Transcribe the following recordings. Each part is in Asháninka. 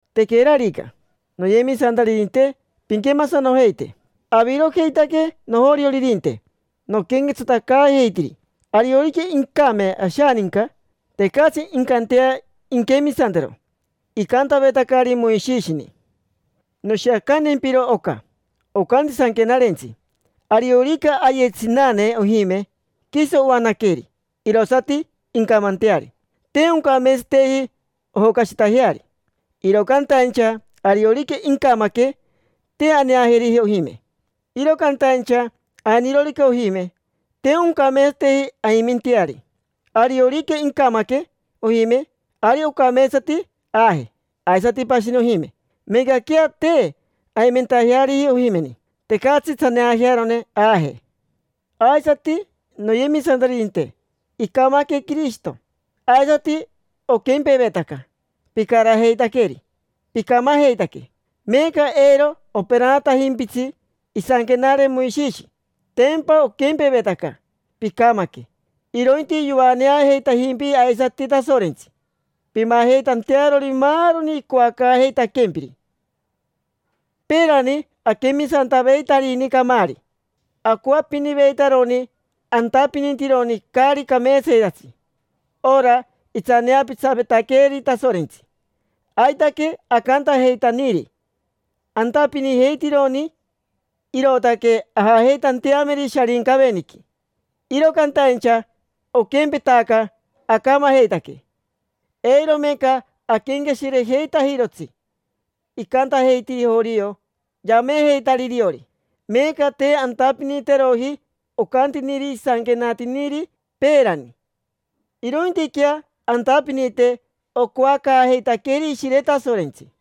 Tequerarica, noyemisantaririnte, pinquemasanojeite. Avirojeitaque nojorioririnte, noquenquetsatacaajeitiri. Ariorica incame ashaninca, tecatsi incantea inquemisantero icantavetacari Moishishini. Noshiacantempiro oca. Ocanti Sanquenarentsi: “Ariorica aye tsinane ojime, quiso oanaqueri, irosati incamanteari. Te oncameetsateji ojocashitajeari”. Iro cantaincha ariorica incamaque, te aneajeriji ojime. Iro cantaincha ainirorica ojime, te oncameetsateji aimenteari. Ariorica incamaque ojime, ari ocameetsati aaje aisati pashini ojime, meecaquea te aimenteariji ojimeni. Tecatsi tsaneajearone aaje. Aisati, noyemisantaririnte, icamaque Quirishito: aisati oquempevetaca picarajeitaqueri, picamajeitaque. Meeca eiro operanatajimpitsi isanquenare Moishishi, tempa oquempevetaca picamaque. Irointi yoaneajeitajimpi aisati Tasorentsi pimajeitantearori maaroni icoacaajeitaquempiri. Peerani aquemisantaveitarini camaari. Acoapiniveitaroni antapinitironi caari cameetsayetatsi, ora itsaneapitsavetaqueeri Tasorentsi. Aitaque acantajeitaniri, antapinijeitironi, irootaque ajajeitanteameri Sharincaveniqui. Iro cantaincha oquempetaca acamajeitaque. Eiro meeca aquenqueshirejeitajirotsi icantajeitiri jorio, yamejeitari iriori. Meeca te antapiniteroji ocantiniri isanquenatiniri peerani, irointiquea antapinite ocoacaajeitaqueeri Ishire Tasorentsi.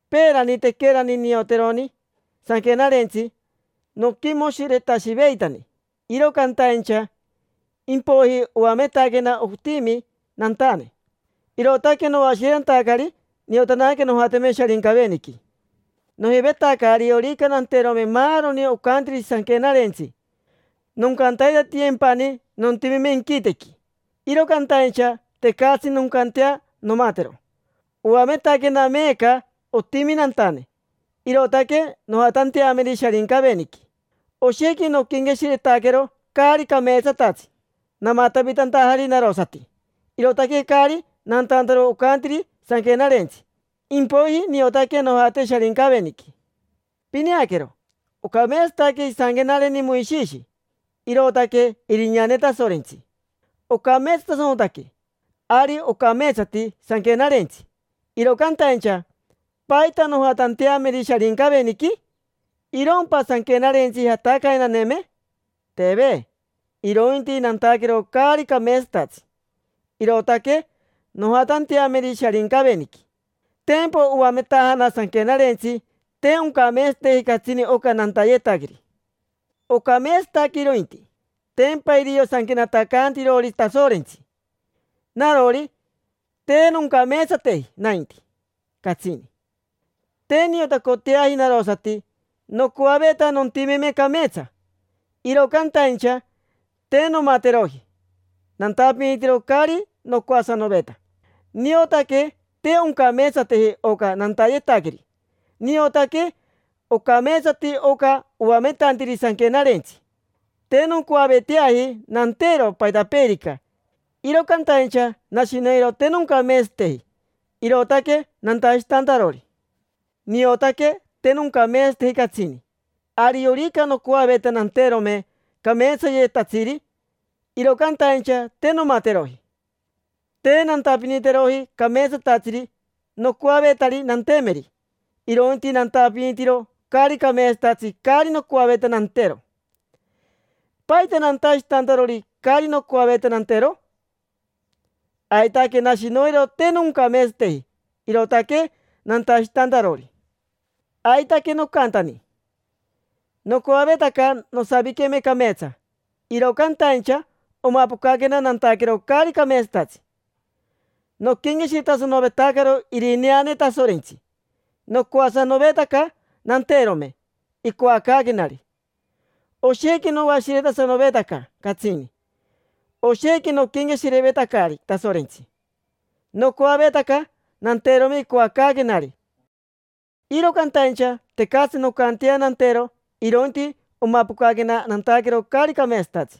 Peerani, tequerani nioteroni Sanquenarentsi, noquimoshiretashiveitani. Iro cantaincha impoiji oametaquena otimi nantane, irootaque noashiretantacari. Niotanaque nojateme Sharincaveniqui. Nojivetaca ariorica nanterome maaroni ocantiri Sanquenarentsi noncantaitatiyempani nontimeme inquitequi, iro cantaincha tecatsi noncantea nomatero. Oametaquena meeca otimi nantane, irootaque nojatanteameri Sharincaveniqui. Oshequi noquenqueshiretaquero caari cameetsatatsi, namatavitantajari narosati, irootaque caari nantantaro ocantiri Sanquenarentsi. Impoiji niotaque nojate Sharincaveniqui. Pineaquero, ocameetsataque isanquenareni Moishishi: irootaque irineane Tasorentsi, ocameetsatasanotaque. Ari ocameetsati Sanquenarentsi, iro cantaincha ¿paita nojatanteameri Sharincaveniqui? ¿Irompa Sanquenarentsi jatacayenaneme? Teve, irointi nantaquero caari cameetsatatsi, irootaque nojatanteameri Sharincaveniqui. Tempa oametajana Sanquenarentsi te oncameetsateji catsini oca nantayetaqueri. Ocameetsataque irointi, tempa irio sanquenatacaantirori Tasorentsi; narori, te noncameetsateji nainti, catsini. Te niotacoteaji narosati: nocoaveta nontimeme cameetsa, iro cantaincha, te nomateroji. Nantapinitiro caari nocoasanoveta. Niotaque te oncameetsateji oca nantayetaqueri, niotaque ocameetsati oca oametantiri Sanquenarentsi. Te noncoaveteaji nantero paitapeerica, iro cantaincha nashi noiro te noncameetsateji, irootaque nantashitantarori. Niotaque te noncameetsateji catsini. Ariorica nocoaveta nanterome cameetsayetatsiri, iro cantaincha te nomateroji. Te nantapiniteroji cameetsatatsiri nocoavetari nantemeri, irointi nantapinitiro caari cameetsatatsi caari nocoaveta nantero. ¿Paita nantashitantarori caari nocoaveta nantero? Aitaque nashi noiro te noncameetsateji, irootaque nantashitantarori. Aitaque nocantani: nocoavetaca nosaviqueme cameetsa, iro cantaincha omapocaquena nantaquero caari cameetsatatsi. Noquenqueshiretasanovetacaro irineane Tasorentsi, nocoasanovetaca nanterome icoacaaquenari. Oshequi noashiretasanovetaca catsini. Oshequi noquenqueshirevetacari Tasorentsi, nocoavetaca nanterome icoacaaquenari. Iro cantaincha tecatsi noncantea nantero, irointi omapocaquena nantaquero caari cameetsatatsi.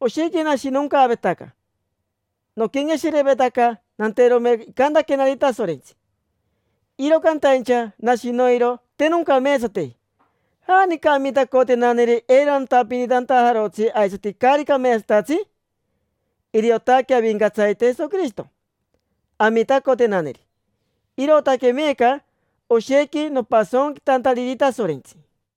Oshequi nashinoncaavetaca. Noquenqueshirevetaca nanterome icantaquenari Tasorentsi, iro cantaincha nashi noiro te noncameetsateji. ¿Janica amitacotenaneri eiro nantapinitantajarotsi aisati caari cameetsatatsi? Iriotaque Avincatsarite Jesoquirishito amitacotenaneri. Irootaque meeca oshequi nopasonquitantariri Tasorentsi.